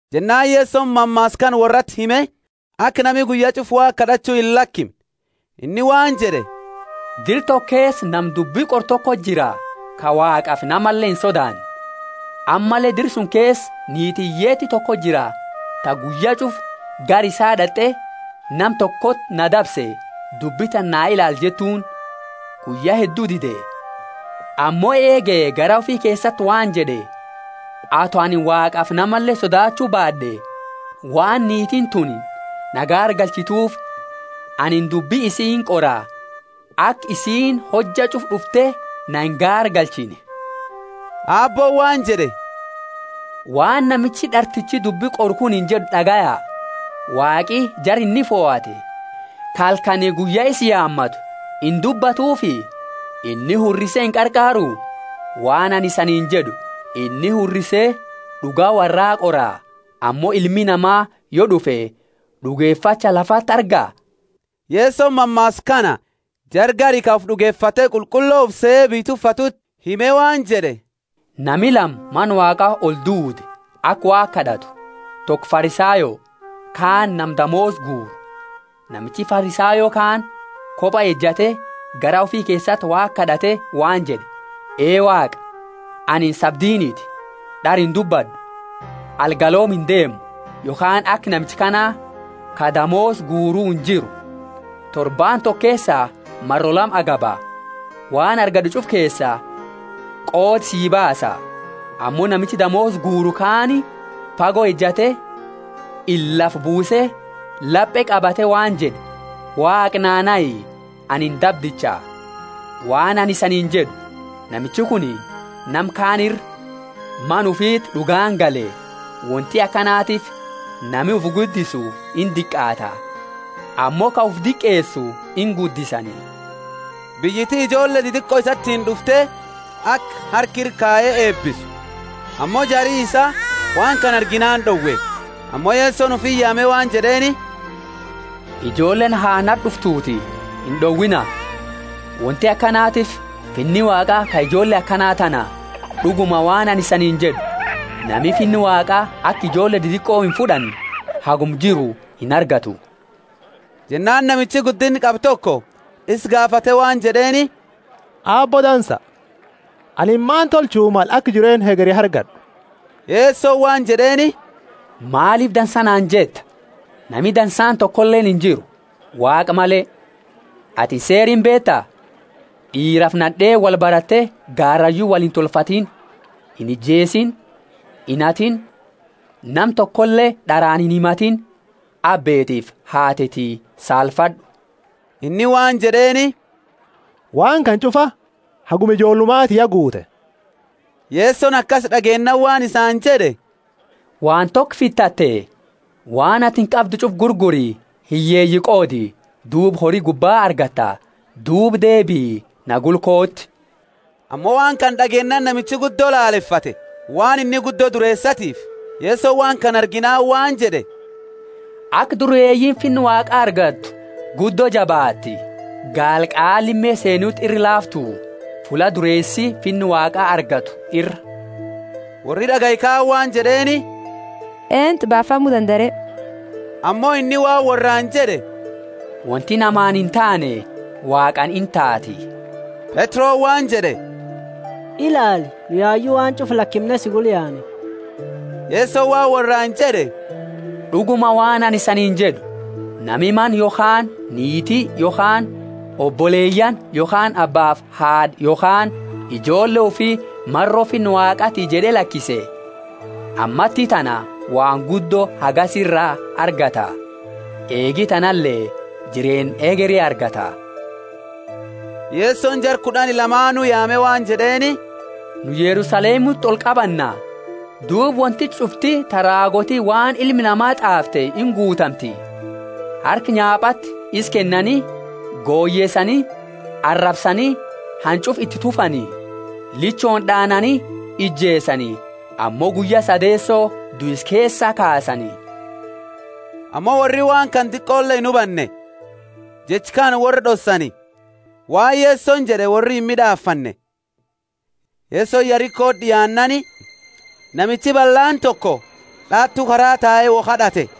Jennaani Yesoni mammaasa kana worrati hime, aka nami guyya ch'ufa Waaqa kad'achu illakimne. Inni waan jed'e, Dira toko keesa nama dubbi qoru tokoti jira ka Waaqafi namale insodaanne. Ammalle dira suni keesa niiti hiyyeeti tokoti jira, ta guyya ch'ufa gara isaa d'at'e, Nama tokoti na dabse, dubbi tana na ilaali jettuuni. Guyya heddu dide, ammo eege garaa ufi keesati waan jed'e, Ato anini Waaqafi namale sodaachu, baad'e, waan niitiini tuni na gaargalchitufi anini dubbi isii inqora, aka isiini hojja ch'ufa d'ufte na ingaargalchine. Aabbooni waan jed'e, Waan namichi d'artichi dubbi qoru kunini jed'u d'agaya. Waaqi jara inni fohate, ka halkani guyya isa yaamatu, indubbatufi? Inni hurrise inqarqaaru? Waan anini isaniini jed'u, Inni hurrise d'uga worraa qora. Ammo Ilmi Nama, yo d'ufe, d'ugefacha lafati arga? Yesoni mammaasa kana jara gari ka ufi d'ugefate qulqullo ufi sehe biyya tuffatuti hime waan jed'e, Nami lama Mana Waaqa olduude aka Waaqa kad'atu; toko Farisayo, kaani nama damoosa guuru. Namichi Farisayo kaani koba ejate garaa ufi keesati Waaqa kad'ate waan jed'e, Ee Waaqa, anini sabdiniti, d'ara indubbad'u, algalooma indeemu, yokhaani aka namicha kana ka damoosa guuru injiru. Torbaani toko keesa maro lama agaba, waan argad'e ch'ufa keesaa qooda sii baasa. Ammo namichi damoosa guuru kaani fago ejate, ila lafa buuse lape qabate waan jed'e, Waaqa naa nahi, anini dabdicha. Waan anini isaniini jed'u, Namichi kuni nama kaani ira mana ufiti d'ugaani gale. Wonti akanatiifi nami ufi guddisu indiqaata, ammo ka ufi diqeesu inguddisani. Biyyiti ijoolle didiqo isaatiini d'ufte aka harka ira kaye eebisu. Ammo jari isaa waan kana arginaani d'owe. Ammo Yesoni ufiti yaame waan jed'eeni, Ijoolleeni ha nati d'uftuuti, ind'owiina; wonti akanatiifi Finni Waaqa ka ijoolle akana tana. D'uguma waan anini isaniini jed'u, Nami Finna Waaqa aka ijoolle didiqo imfud'anne haguma jiru inargatu. Jennaani namichi guddinna qabu toko isa gaafate waan jed'eeni Aabbo dansa, anini maani tolchu male aka jireenna hegeri argad'u? Yesoni waan jed'eeni, Maalifi dansa naani jetta? Nami dansaani tokoleeni injiru, Waaqa male. Atini seera imbeeta, d'iirafi nad'eeni wolbarate garayu wolintolfatini inijeesiini; inhatiini; nama tokole d'araani inhimatiini abbeetiifi haateti saalfad'u. Inni waan jed'eeni, Waan kana ch'ufa haguma ijoollumati ya guute. Yesoni akasi d'ageennaani waan isaani jed'e, Waan toko fitate; waan atini qabdu ch'ufa gurguri, hiyyeeyi qoodi, duuba hori gubba argatta, duuba deebii, na gula kooti. Ammo waan kana d'ageennaani namichi guddo laalefate, waan inni guddo dureesatiifi. Yesoni waan kana arginaani waan jed'e, Aka dureeyiini Finna Waaqa argattu guddo jabaatti. Gaala qaa lime seenuti ira laaftu, fulla dureesi Finna Waaqa argatu ira. Worri d'agaye kaani waan jed'eeni, Eentu baafamu dandaa re? Ammo inni waan worraani jed'e, Wonti namaani intaane Waaqaani intaati. Petroni waan jed'e, Ilaali, nu yayu waan ch'ufa lakimne si gula yaane. Yesoni waan worraani jed'e, D'uguma waan anini isaniini jed'u, Nami mana yokhaani niiti yokhaani oboleyaani yokhaani abbaafi haad'a yokhaani ijoolle ufi, maro Finna Waaqati jed'e lakise, ammatitana waan guddo hagasi iraa argata, eege tanale jireenna hegeri argata. Yesoni jara kud'ani lamaanu yaame waan jed'eeni, Nu Yerusalemuti olqabanna, duuba wonti ch'ufti ta raagooti waan Ilma Nama t'aafte inguutamti. Harka nyaapati isa kennani, goyeesani arabsani, hanch'ufa iti tufani; lichooni d'aanani ijeesani, ammo guyya sadeeso duisa keesaa kaasani. Ammo worri waan kana diqoole inhubanne, jecha kana worra d'ossani, waan Yesoni jed'e worri imid'afanne. Yesoni Yerikoti d'iaannaani namichi ballaani toko d'aatu kara tae wo kad'ate.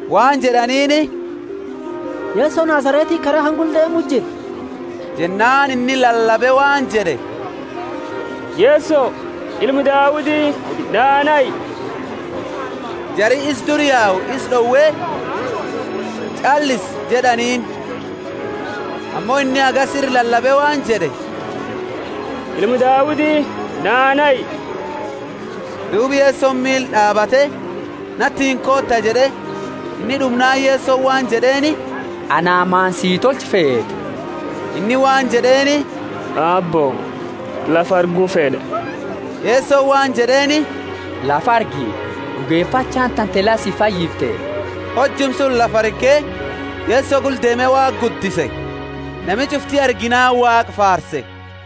Waan jed'aniini, Yeso Nazaretiti kara kana gula deemu jira. Jennaani inni lalabe waan jed'e, Yeso, Ilma Daudi, naa nahi. Jari isa dura yayu isa d'owe, Ch'allisi jed'aniini. Ammo inni hagasi ira lalabe waan jed'e Ilma Daudi, naa nahi. Duuba Yesoni miila d'aabate, Natiini koota jed'e, Inni d'umnaani Yesoni waan jed'eeni, Ana maani si tolchu feeta? Inni waan jed'eeni, Aabbo, lafa argu fed'a. Yesoni waan jed'eeni, Lafa argi! D'ugefachaani tante la si fayyifte. Hojuma suni lafa arge, Yeso gula deeme Waaqa guddise. Nami ch'ufti arginaani Waaqa faarse.